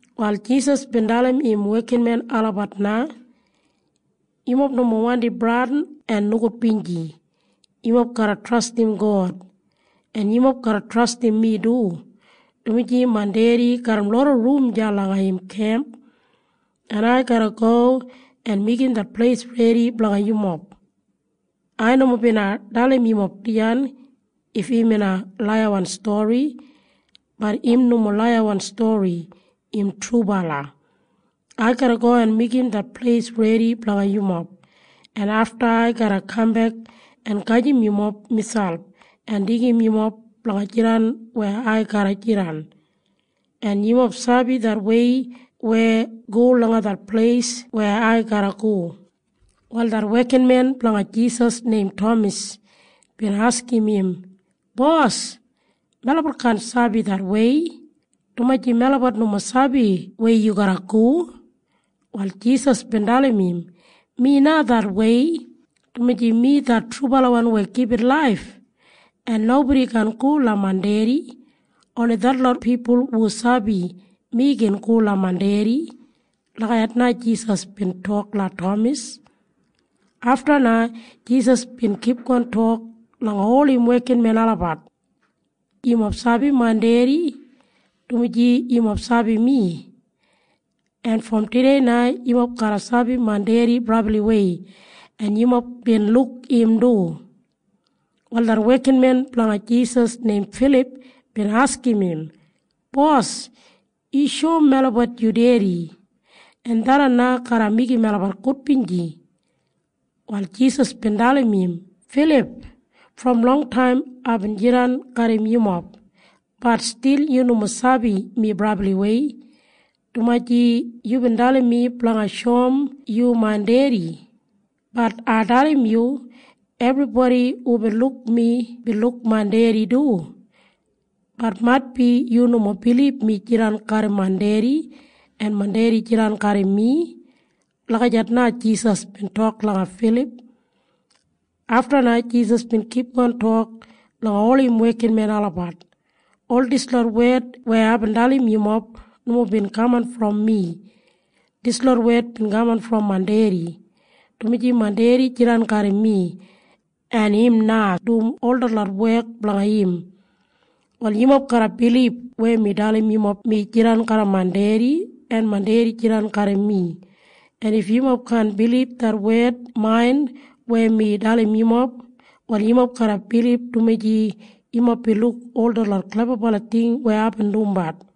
Wal Jisas bin dalim im wekinmen olabat na, “Yumob nomo wandi bradin en nogudbinji. Yumob garra trastim God, en yumob garra trastim mi du, dumaji main Dedi garram loda rum deya langa im kemp, en ai garra go en meigim det pleis redi blanga yumob. Ai nomo bina dalim yumob dijan if im bina laiyawan stori. Bat im nomo laiyawan stori. Im trubala. Ai garra go en meigim det pleis redi blanga yumob, en afta ai garra kambek en gajim yumob miselp en deigim yumob blanga jidan weya ai garra jidan. En yumob sabi det wei weya go langa det pleis weya ai garra go.” Wal det wekinmen blanga Jisas neim Tamas bin askim im, “Bos, melabat kaan sabi det wei, dumaji melabat nomo sabi weya yu garra go.” Wal Jisas bin dalim im, “Mi na det wei, dumaji mi det trubalawan weya gibit laif. En nobodi kaan go langa main Dedi. Oni detlot pipul hu sabi mi gin go langa main Dedi.” Lagijat na Jisas bin tok langa Tamas. Afta na Jisas bin kipgon tok langa ol im wekinmen olabat, “Yumob sabi main Dedi, dumaji yumob sabi mi. En brom tudei na yumob garra sabi main Dedi brabliwei. En yumob bin luk im du.” Wal det wekinmen blanga Jisas neim Filip bin askim im, “Bos, yu shoum melabat yu Dedi. En tharran na garra meigim melabat gudbinji.” Wal Jisas bin dalim im, “Filip, brom longtaim aibin jidan garram yumob. Bat stil yu nomo sabi mi brabliwei, dumaji yubin dalim mi blanga shoum yu main Dedi. Bat ai dalim yu. Ebribodi hubin luk mi bin luk main Dedi du. Bat maitbi yu nomo bilib mi jidan garram main Dedi en main Dedi jidan garram mi.” Lagijat na Jisas bin tok langa Filip. Afta na Jisas bin kipgon tok langa ol im wekinmen olabat, “Ol dislot wed weya aibin dalim yumob nomo bin kaman brom mi. Dislot wed bin kaman brom main Dedi, dumaji main Dedi jidan garram mi, en im na dum ol detlot wek blanga im. “Wal yumob garra bilib weya mi dalim yumob mi jidan garram main Dedi en main Dedi jidan garram mi. En if yumob kaan bilib det wed main weya mi dalim yumob, wal yumob garra bilib dumaji yumob bin luk ol detlot klebabala ting weya aibin dumbat.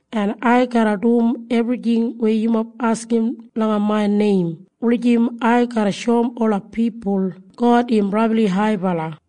en ai garra dum ebrijing weya yumob askim langa main neim wulijim ai garra shoum ola pipul God im brabli haibala.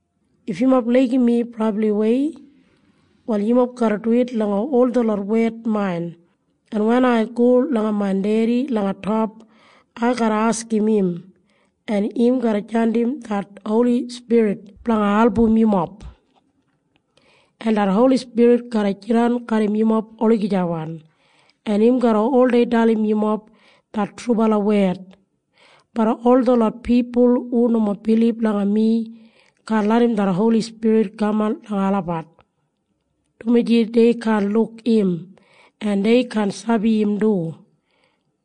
If yumob laigim mi brabliwei, wal yumob garra duwit langa ol detlot wed main, en wen ai go langa main Dedi langa top, ai garra askim im, en im garra jandim det Holi Spirit blanga album yumob, en det Holi Spirit garra jidan garram yumob olagijawan, en im garra oldei dalim yumob det trubala wed. Bat ol detlot pipul hu nomo bilib langa mi kaan larram det Holi Spirit kaman langa olabat, dumaji dei kaan luk im, en dei kaan sabi im du.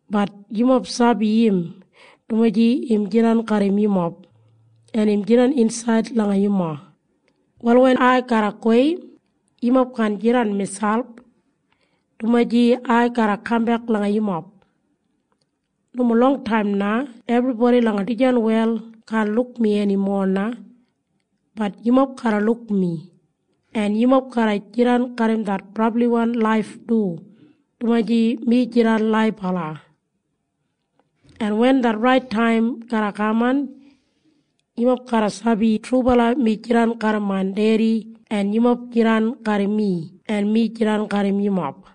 Bat yumob sabi im, dumaji im jidan garram yumob, en im jidan insaid langa yumob. “Wal wen ai garra gowei, yumob kaan jidan miselp, dumaji ai garra kambek langa yumob. Nomo longtaim na ebribodi langa dijan wel kaan luk mi enimo na. Bat yumob garra luk mi, en yumob garra jidan garram det brabliwan laif du, dumaji mi jidan laibala. En wen det rait taim garra kaman, yumob garra sabi trubala mi jidan garram main Dedi en yumob jidan garram mi en mi jidan garram yumob.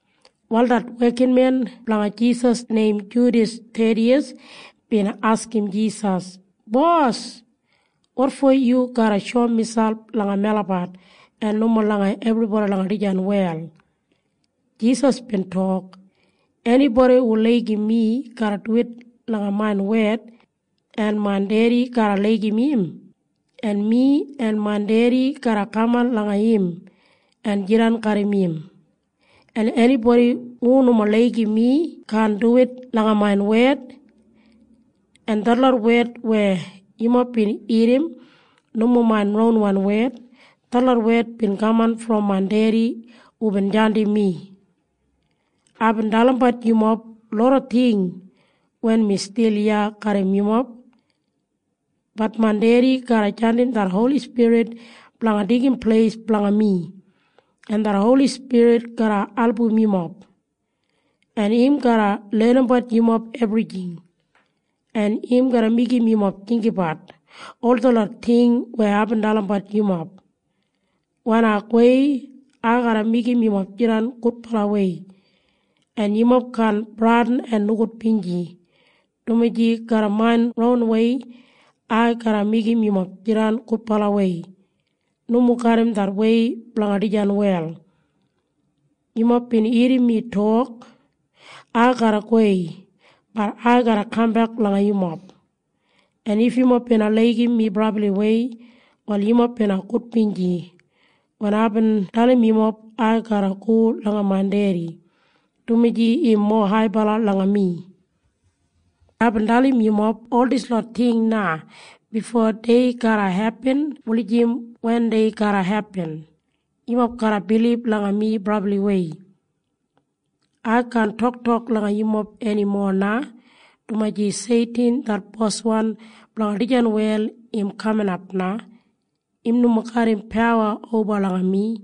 Wal det wekinmen blanga Jisas neim Judas Thediyas bin askim Jisas, “Bos, wotfo yu garra shoum miselp langa melabat en nomo langa ebribodi langa dijan wel?” Jisas bin tok, “Enibodi hu laigim mi garra duwit langa main wed, en main Dedi garra laigim im, en mi en main Dedi garra kaman langa im en jidan garram im. En enibodi hu nomo laigim mi kaan duwit langa main wed. En detlot wed weya yumob bin irrim nomo main ronwan wed. Detlot wed bin kaman brom main Dedi hubin jandim mi. “Aibin dalimbat yumob loda ting wen mi stil iya garram yumob. Bat main Dedi garra jandim det Holi Spirit blanga deigim pleis blanga mi, en det Holi Spirit garra album yumob, en im garra lenimbat yumob ebrijing, en im garra meigim yumob jinggabat ol detlot ting weya aibin dalimbat yumob. “Wen ai gowei, ai garra meigim yumob jidan gudbalawei, en yumob kaan bradin en nogudbinji, dumaji garram main ronwei ai garra meigim yumob jidan gudbalawei. Nomo garram det wei blanga dijan wel. “Yumob bin irrim mi tok, ‘Ai garra gowei. Bat ai garra kambek langa yumob.’ En if yumob bina laigim mi brabliwei, wal yumob bina gudbinji wen aibin dalim yumob ai garra go langa main Dedi, dumaji im mowa haibala langa mi. “Aibin dalim yumob ol dislot ting na bifo dei garra hepin wulijim wen dei garra hepin, yumob garra bilib langa mi brabliwei. “Ai kaan toktok langa yumob enimo na, dumaji Seitin det boswan blanga dijan wel im kaminap na. Im nomo garram pawa oba langa mi.